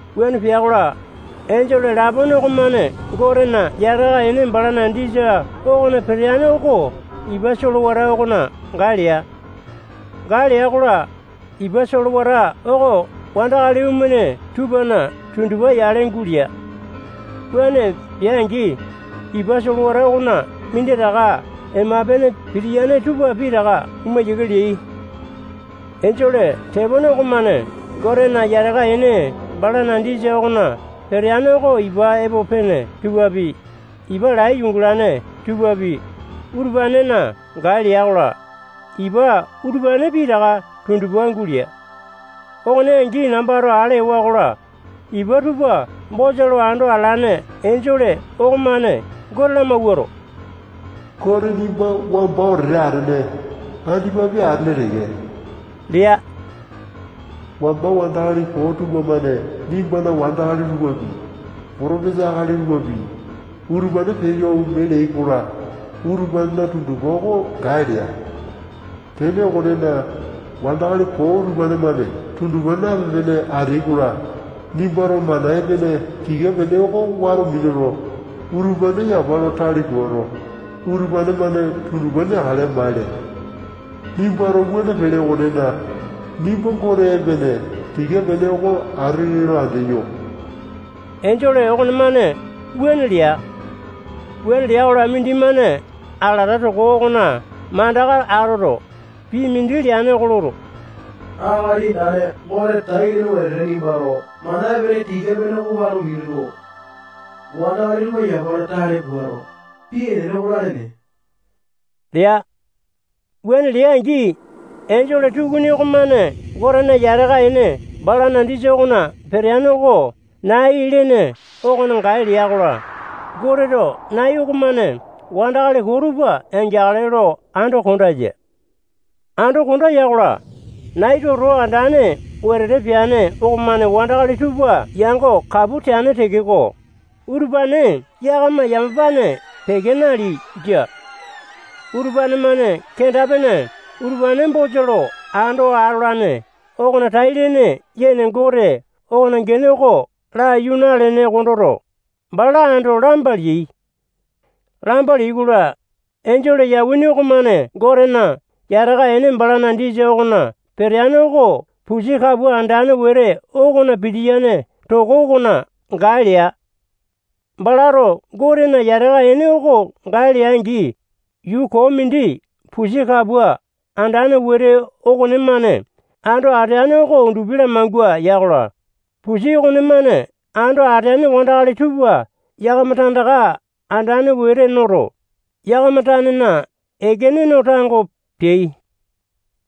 Wuane pea-kola, enjole lapone okomane Gotena yataka ene balana disa okona peteane oko ipa solewata okona gae lea. Gae lea-kola, ipa solewata oko wandakali omene tupana tundupa yale gulea. Wuane pea-angi, ipa solewata okona minditaka ema-pene pitiyane tupa pitaka oma yiake leai. Enjole tepone okomane Gotena yataka ene balana disa okona peteane oko ipa epo pene tupapi, ipa lai yungalane tupapi, utupanena gae lea-kola, ipa utupane pitaka tundupa gulea. Okone angi, nambato ale ewa-kola, ipa tupa bosa lo ando atalane enjole okomane Gote lamawuato, Gote nimba wamba wetete atene, andipapi atele teke lea. Wamba wandakali koo tupamane nimbana wandakali tupapi, potopesa akali tupapi, utupane peyo ome leai-kola, utupanena tundupa oko gae lea. Tene okonena, wandakali koo utupane-mane tundupa nape-pene ateai-kola, nimbato mana epene tika-pene oko wato minuto, utupane yapa lo tale puato, utupane-mane tundupa neakale maele. Nimbato wuane pele okonena, nimba Gote epene tika-pene oko atele lo andeyo. Enjole okonemane wuane lea. Wuane lea-kola, mindimane alata toko okona mandaka atoto, pii mindi leane oko loto, Akali Andane Gote tai-lene wetete nimbato mana epene tika-pene oko wato minuto, wandakali tupa yapa lo tale puato, pii enene oko lalene lea. Wuane lea-angi, enjole tukuni okomane Gotena yataka ene balana disa okona peteane oko nai lene okona gae lea-kola, Goteto nai okomane wandakali koo tupa yangeakale lo ando konda ya. Ando konda ya-kola, nai toto andane wetete peane okomane wandakali tupa yango kapu teane tekeko, utupane yakama yamapane peke naleai. Jia. Utupane-mane kenda-pene utupane bosa lo ando atolane okona tai-lene yene Gote okona gene oko laiyu nalene kondoto, bala ando lamba leai. Lamba leai-kola, enjole yauwini okomane Gotena yataka ene balana disa okona peteane oko pusi kapua andane wete okona pitiyane toko okona gae lea. Balato Gotena yataka ene oko gae lea-angi, yuu koo mindi pusi kapua andane wete okonemane ando ateane oko undupi lamangua ya-kola, pusi okonemane ando ateane wandakali tupa yakama tandaka andane wete noto, yakama tanena ekene no tango peai.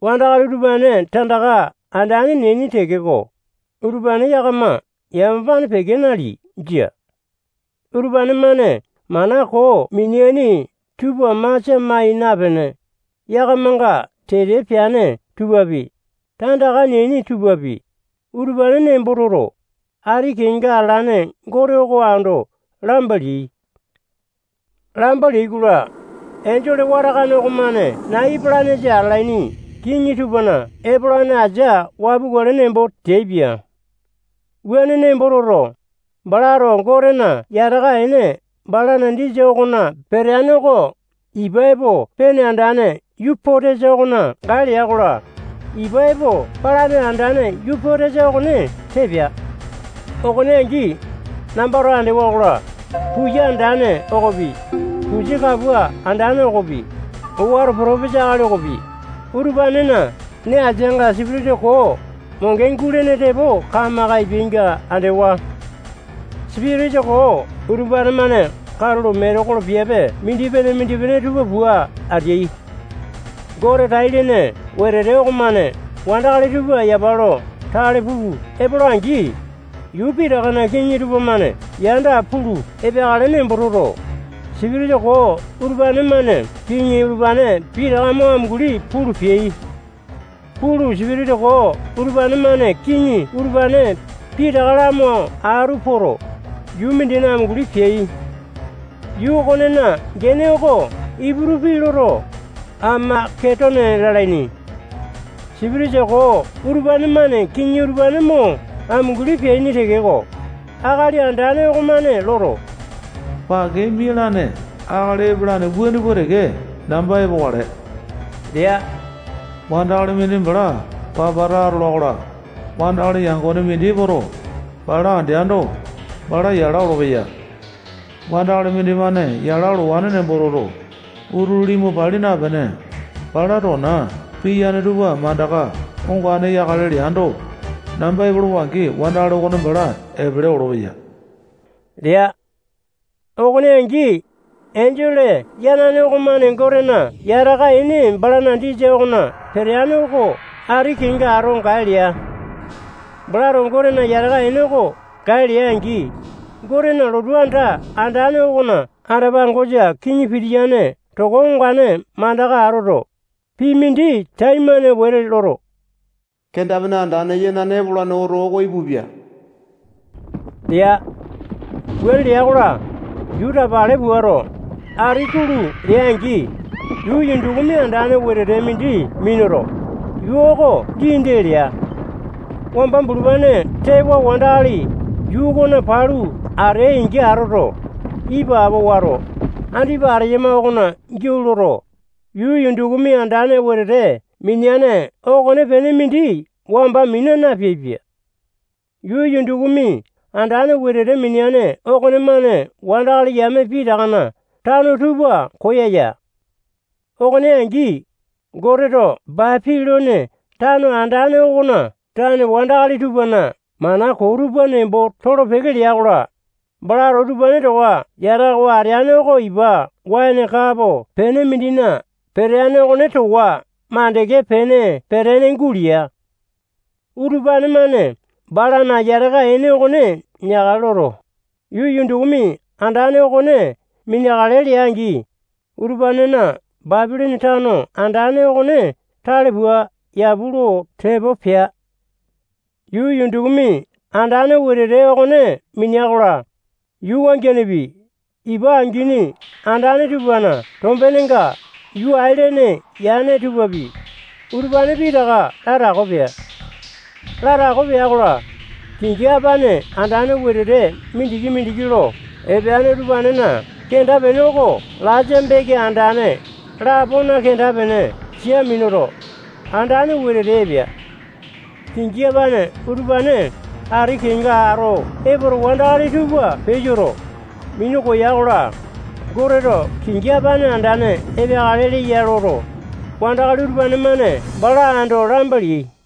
Wandakali utupane tandaka andane neaini tekeko, utupane yakama yamapane peke naleai. Jia. Utupane-mane mana koo mineaini tupa masia mai napene, yakamanga tete peane tupapi, tandaka neaini tupapi, utupane nembo toto, ati kenga atalane Gote oko ando lamba leai. Lamba leai-kola, enjole watakane okomane nai epalanesa atalaini kiŋi tupana epolane asia wapukale nembo teaipia. Wuane nembo toto, balato Gotena yataka ene balana disa okona peteane oko ipa epo pene andane Yupotesa okona gae lea-kola, ipa epo palane andane Yupotesa okone tee pea. Okone angi, nambato andewa-kola, puya andane okopi, pusi kapua andane okopi, owato potopesa akali okopi, utupanena nee asianga sipitisa koo monge gulene tepo kamaka epeainga andewa. Sipitisa koo utupane-mane katulo metekolo piape mindipene-mindipene tupa pua ateai. Gote tai-lene wetete okomane wandakali tupa yapa lo tale pulu epola-angi, yuu pitakana kiŋi tupamane yanda pulu epeakale nembo toto, sipitisa koo utupane-mane kiŋi utupane pitaka mo amunguli pulu peai. Pulu, Sipitisa koo utupane-mane kiŋi utupane pitaka lamo atu poto, yuu mindina amunguli peai. Yuu okonena gene oko Iputu pii loto, Amaketone lalaini. Sipitisa koo utupane-mane kiŋi utupane mo amunguli peaini tekeko, Akali Andane okomane loto, pake mialane akali epalane wuane pua teke namba epokale lea. Wandakali mindi bala papata atola-kola, wandakali yangone mindi epoto, bala andeando, bala yala olopeya. Wandakali mindimane yala olowane nembo toto, utulu limu pali napene, balana tona piyane tupa mandaka ongane yakale leando, namba epolowa-angi, wandakali okone bala epele olopeya lea. Okone angi, enjole yanane okomane Gotena yataka ene balana disa okona peteane oko ati kenga ato gae lea. Balato Gotena yata ene oko gae lea-angi, Gotena lotu anda andane okona anda-pangosa kiŋi pitiyane toko ongane mandaka atoto, pii mindi taimane wete loto, kenda-pene andane yanane oko epolane oto oko ipupia lea. Wuane lea-kola, yuu tapale puato, ati kulu lea-angi, yuu yundukumi andane wetete mindi minuto, yuu oko dii-dee lea. Wamba bulupane tewa wandakali yuu okona palu ateai-angi atoto, ipapo wato, andipa ateyama okona giau loto, yuu yundukumi andane wetete mineane okonepene mindi wamba mina napeaipia. Yuu yundukumi andane wetete mineane okonemane wandakali yame pitakana tano tupa koyaya. Okone angi, Goteto Bapilone tano andane okona tane wandakali tupana mana koo tupa nembo tolo-peke lea-kola, balato utupane towa yatakawa ateane oko ipa waene kapo pene mindina peteane okone towa mandeke pene petene gulea. Utupane-mane balana yataka ene okone neakale loto, yuu yundukumi andane okone mineakale lea-angi, utupanena Bapilone tano andane okone tale pua yapu lo tepo pea. Yuu yundukumi andane wetete okone minea-kola, yuu wangianepi, ipa angini andane tupana tombenenga yuu ailene yane tupapi, utupane pitaka latako pea. Latako pea-kola, kingi apane andane wetete mindiki-mindiki lo epeane utupanena kenda-pene oko laisa beke andane lapona kenda-pene sia minuto, andane wetete epea. Kingi apane utupane ati kenga ato epoto, wandakali tupa peyoto, minu koya-kola, Goteto kingi apane andane epeakale leya loto, wandakali utupane-mane bala ando lamba leai.